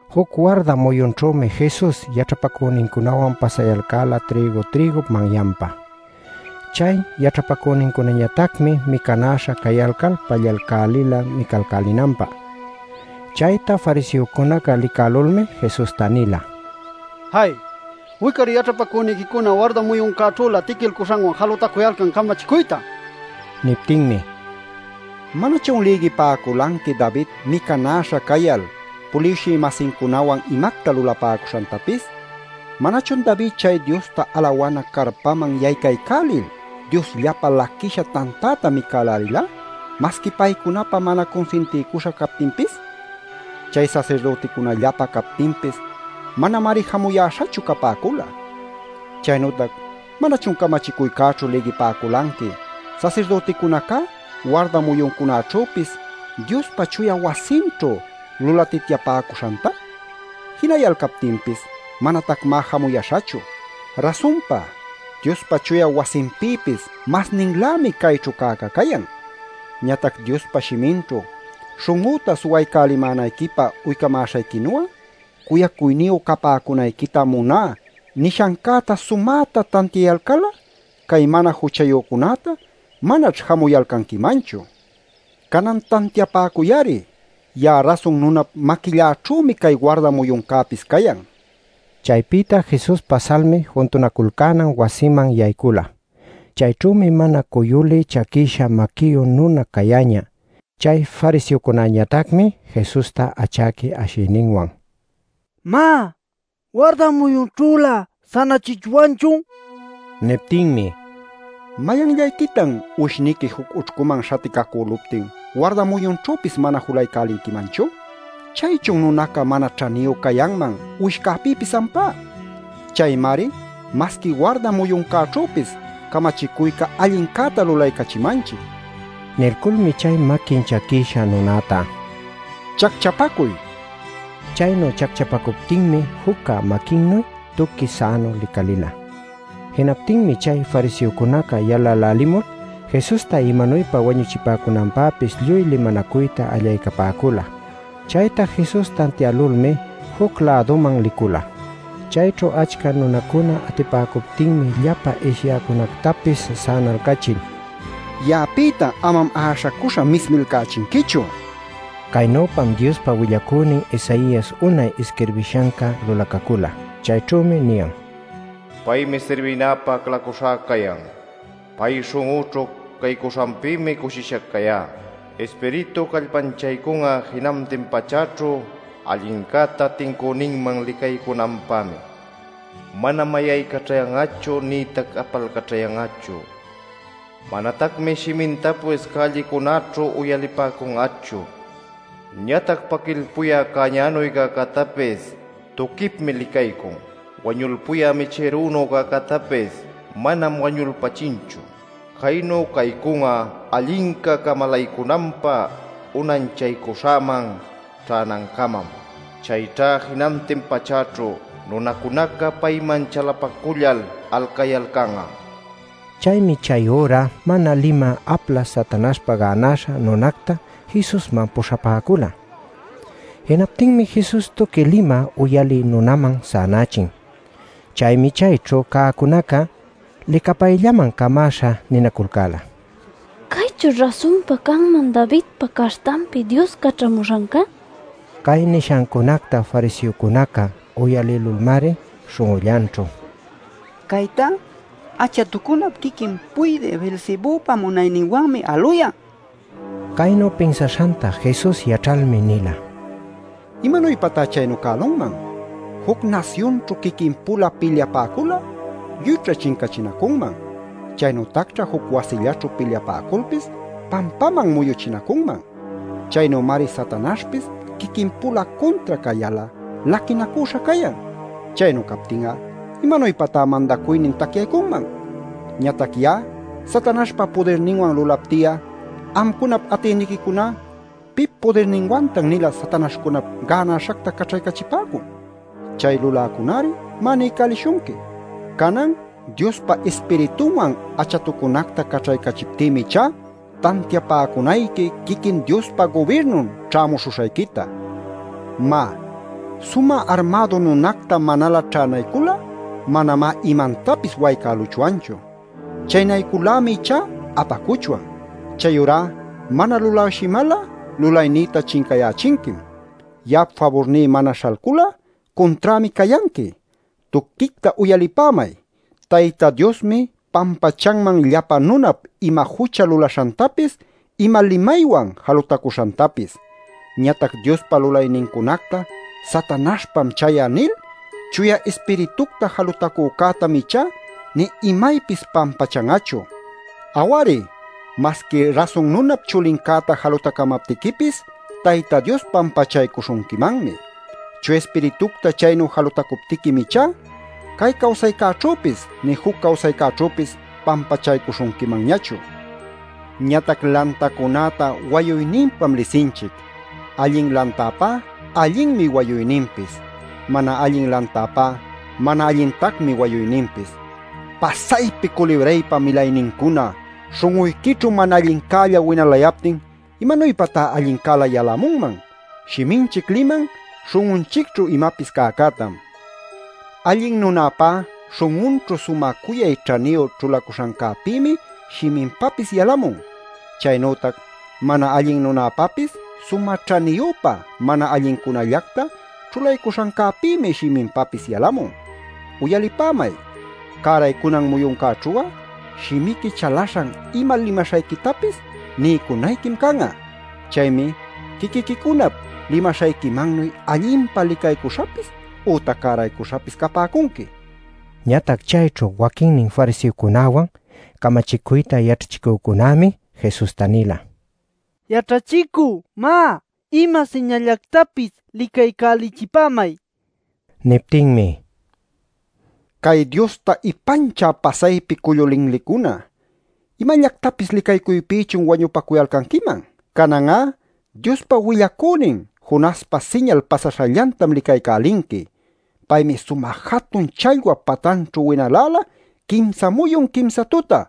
Juc warda muyunćhümi Jesus yaćhapacünincunawan pasayalcäla trïgu-trïgup manyanpa. Chay yaćhapacünincunañatacmi micanäśha cayalcal pallalcälila micalcälinanpä. Chayta fariseocunaca licälulmi Jesusta nila: “¡Jay! Wic-ari yaćhapacüniquicuna warda muyuncäćhülä tiquilcuśhanwan jalutacuyalcan camachicuyta” nil. Niptinmi: “¿Manachun lïgipäculanqui David micanäśha cayal puliwshï-masincunawan imacta lulapäcuśhantapis? ¿Manachun David, chay Diosta alawana carpanman yaycaycälil Diosllapä laquïsha tantäta micälälila masqui paycunapä mana cunsintiycuśha captinpis? Chay sasirdüticunallapä captinpis manamari jamuyäśhachu capäcula. Chaynütac ¿manachun camachicuycäćhu lïgipäculanqui sasirdüticunacá warda muyuncunaćhüpis Diospa chuya wasinćhu lulatityapäcuśhanta? Jinayalcaptinpis manatacmá jamuyäśhachu. Rasunpa Diospa chuya wasinpïpis masninlämi cayćhu cäca cayan. Ñatac Diospa shiminćhu: ‘Śhun'üta suwaycälimänayquipä uycamäśhayquinu'a, cuyacuyniyu capäcunayquitam muná’ nishancäta sumäta tantiayalcal'a, cay mana juchayücunäta manaćh jamuyalcanquimanchu. Canan tantiapäcuy-ari: ya'a Rasun Nunap maquilläćhümi cay warda muyuncäpis cayan” nila. Chaypïta Jesus pasalmi juntunaculcänan wasiman yaycula. Chayćhümi mana cuyulï chaquïsha maquiyu nuna cayäñä. Chay fariseocunäñatacmi Jesusta achäqui ashiyninwan: “Má, ¿warda muyunćhülä sänachichwanchun?” nila. Niptinmi: “¿Mayanllayquitan uwishniqui juc ućhcuman śhaticacüluptin, warda muyunćhüpis mana julaycälinquimanchu? ¿Chaychun nunaca mana ćhaniyu cayanman uwishcäpïpis ampá? Chaymari masqui warda muyuncäćhüpis camachicuyca allincäta lulaycachimanchic” nila. Nilculmi chay maquin chaquïsha nunäta: “Chacchapacuy” nila. Chaynu chacchapacuptinmi jucca maquinnuy tuqui sänu licalïla. Jinaptinmi chay fariseocuna yalälälimul, Jesusta imanuypa wañuchipäcunanpäpis lluy limanacuyta allaycapäcula. Chayta Jesus tantiälulmi juc-läduman licula. Chayćhu achca nunacuna atipäcuptinmi llapa ishyäcunactapis sänalcachil: “Ya'apïta amam äśhacüśha mismilcachinquichu” nila. Caynüpam Diospa willacünin Isaias unay isquirbishanca lulacacüla. Chayćhümi niyan: “Paymi sirbïnïpa aclacuśhäca cayan. Pay śhun'üćhu caycuśhanpïmi cushisha cayá. Ispiritú callpanchaycun'a jinantin pachäćhu allincäta tincüninman licaycunanpämi. Manam äśhaycaćhayan'achu, nïtac apalcaćhayan'achu. Manatacmi shimintapis cällicunallaćhu uyalipäcun'achu. Ñatac paquilpuyä cäñanuy cäcätapis tuquipmi licaycun. Wañulpuyä michïrunu cäcätapis manam wañulpächinchu. Caynu caycun'a allinca camalaycunanpä unanchaycuśhäman ćhänancamam. Chayćha jinantin pachäćhu nunacunaca payman chalapacullal alcayalcan'a” nil. Chaymi chay üra mana limä apla Satanaśhpa gänäśha nunacta Jesusman puśhapäcula. Jinaptinmi Jesus tuqui limä uyalï nunaman sänächin. Chaymi chayćhu cäcunaca licapayllaman camäśha ninaculcäla: “¿Caychućh rasunpa canman Davidpa caśhtanpi, Dios caćhamuśhancá?” nil. Cay nishancunacta fariseocunaca uyalïlulmari śhun'ullanćhu: “¡Caytá achatucunap quiquin puydï Beelzebüpa munayninwanmá aluyan!” nipäcula. Caynu pinsaśhanta Jesus yaćhalmi nila: “¿Imanuypatá chaynu cälunman? Juc nasyunćhu quiquin-pula pilyapäcul'a lluyćha chincachinacunman. Chaynütacćha juc wasillaćhu pilyapäculpis pampaman muyuchinacunman. Chaynümari Satanaśhpis quiquin-pula cuntra cayal'a laquinacüśha cayan. Chaynu captin'a ¿imanuypatá mandacuynin tacyaycunman? Ñatac ya'a, Satanaśhpa pudirninwan lulapti'a amcunap atïniquicuná ¿pip pudirninwantan-nila satanaśhcunap gänäśhacta caćhaycachipäcun? Chay luläcuna-ari, má, niycälishunqui. Canan Diospa Ispiritunwan achatucunacta caćhaycachiptïmi ichá, tantiapäcunayqui quiquin Diospa gubirnun ćhämuśhuśhayquita. “Má, sumä armädu nunacta manalä ćhänaycul'a manamá imantapis waycäluchwanchu. Chaynaycul-lämi ichá apacuchwan. “Chayurá mana lulawshimal'a, lulaynïta chincayächinquim. Ya'ap faburní mana śhalcul'a, cunträmi cayanqui. Tuquicta uyalipämay: Tayta Diosmi pampachanman llapa nunap ima jucha lulaśhantapis ima limaywan jalutacuśhantapis. Ñatac Diospa lulaynincunacta ‘Satanaśhpam chay'a’ nil Chuya Ispiritucta jalutacücätam ichá nï imaypis pampachan'achu. Aw-ari, masqui Rasun Nunap Chulincäta jalutacamaptiquipis Tayta Dios pampachaycuśhunquimanmi. Chuya Ispiritucta chaynu jalutacuptiquim ichá cay cawsaycäćhüpis nï juc cawsaycäćhüpis pampachaycuśhunquimanñachu. “Ñatac lantacunäta wayuyninpam lisinchic: Allin lantäpá allinmi wayuyninpis, mana allin lantäpá mana allintacmi wayuyninpis. ¡Pasaypi culibraypa milaynincuna! Śhun'uyquićhu mana allincälla winalayaptin ¿imanuypatá allincälä yalämunman? Shiminchic liman śhun'unchicćhu imapis cäcätam. Allin nunäpá śhun'unćhu sumä cuyay ćhaniyu ćhulacuśhancäpïmi shiminpapis yalamun. Chaynütac mana allin nunäpapis sumä ćhaniyüpa mana allincunallacta ćhulaycuśhancäpïmi shiminpapis yalamun. Uyalipämay: Cäraycunan muyuncäćhu'a shimiqui chalaśhan ima limaśhayquitapis niycunayquim can'a. Chaymi quiquiquicunap limaśhayquimannuy allinpa licaycuśhapis ütac cäraycuśhapis capäcunqui” nila. Ñatac chayćhu waquinnin fariseocunawan, camachicuyta yaćhachicücunämi Jesusta nila: “Yaćhachicü, má, ima siñalllactapis licaycälichipämay” nil. Niptinmi: “Cay Diosta ipanchä pasaypi cullu linlicuna, ¿imallactapis licaycuypïchun wañupacuyalcanquiman? Canan'á Diospa willacünin Jonaspa siñal pasaśhallantam licaycälinqui. Paymi sumä jatun challwap patanćhu winalälä quimsa muyun quimsa tuta;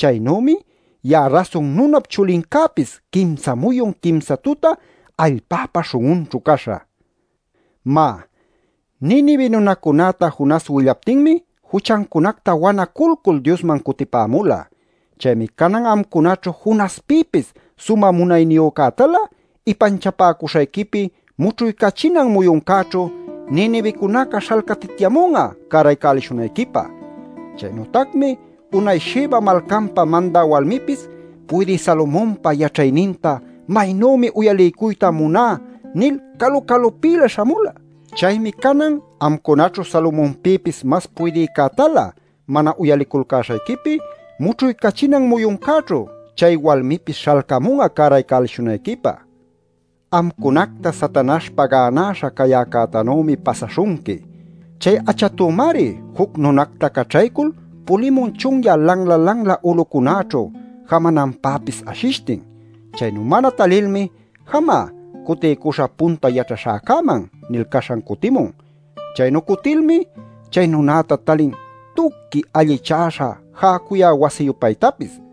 chaynümi ya'a Rasun Nunap Chulincäpis quimsa muyun, quimsa tuta allpäpa śhun'unćhu caśhä. Má, Ninive nunacunäta Jonas willaptinmi juchancunacta wanaculcul Diosman cutipämula. Chaymi canan amcunaćhu Jonaspïpis sumä munayniyücätalä ipanchapäcuśhayquipi mućhuycachinan muyuncäćhu Ninivecunaca śhalcatityamun'a cäraycälishunayquipä. “Chaynütacmi unay Sheba malcanpa mandä walmipis ‘Puydï Salomonpa yaćhayninta maynümi uyaliycuyta muná’ nil calu-calupïlä śhamula. Chaymi canan amcunaćhu Salomonpïpis mas puydïcätalä mana uyaliculcäśhayquipi mućhuycachinan muyuncäćhu chay walmipis śhalcamun'a cäraycälishunayquipä. “Amcunacta Satanaśhpa gänaśha cayäcätanümi pasaśhunqui. Chay achatümari juc nunacta caćhaycul pulimun chunyä lanla-lanla ulucunäćhu, jamananpäpis ashishtin. Chaynu mana talilmi ‘Jamá, cutiycuśhä punta yaćhaśhäcäman’ nil caśhan cutimun. Chaynu cutilmi chay nunäta talin tuqui allichäśha jäcuyä wasi-yupaytapis.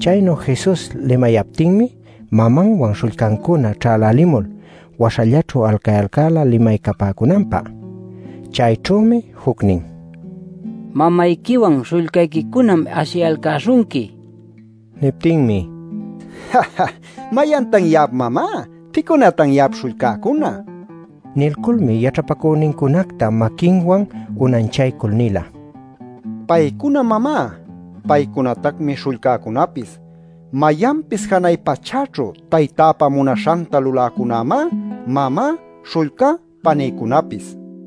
Chaynu Jesus limayaptinmi mamanwan śhullcancuna ćhälälimul waśhallaćhu alcayalcäla limaycapäcunanpä. Chayćhümi jucnin: “Mamayquiwan śhullcayquicunam ashiyalcäśhunqui” nin. Niptinmi: “¿Mayantan ya'ap mamá? ¿Pïcunatan ya'ap śhullcäcuna?” nila. Nilculmi yaćhapacünincunacta maquinwan unanchaycul nila: “Paycunam mamá. Paycunatacmi śhullcäcunapis. Mayanpis janay pachäćhu Taytäpa munaśhanta luläcunämá, mamá, śhullcá, panïcunäpis” nil.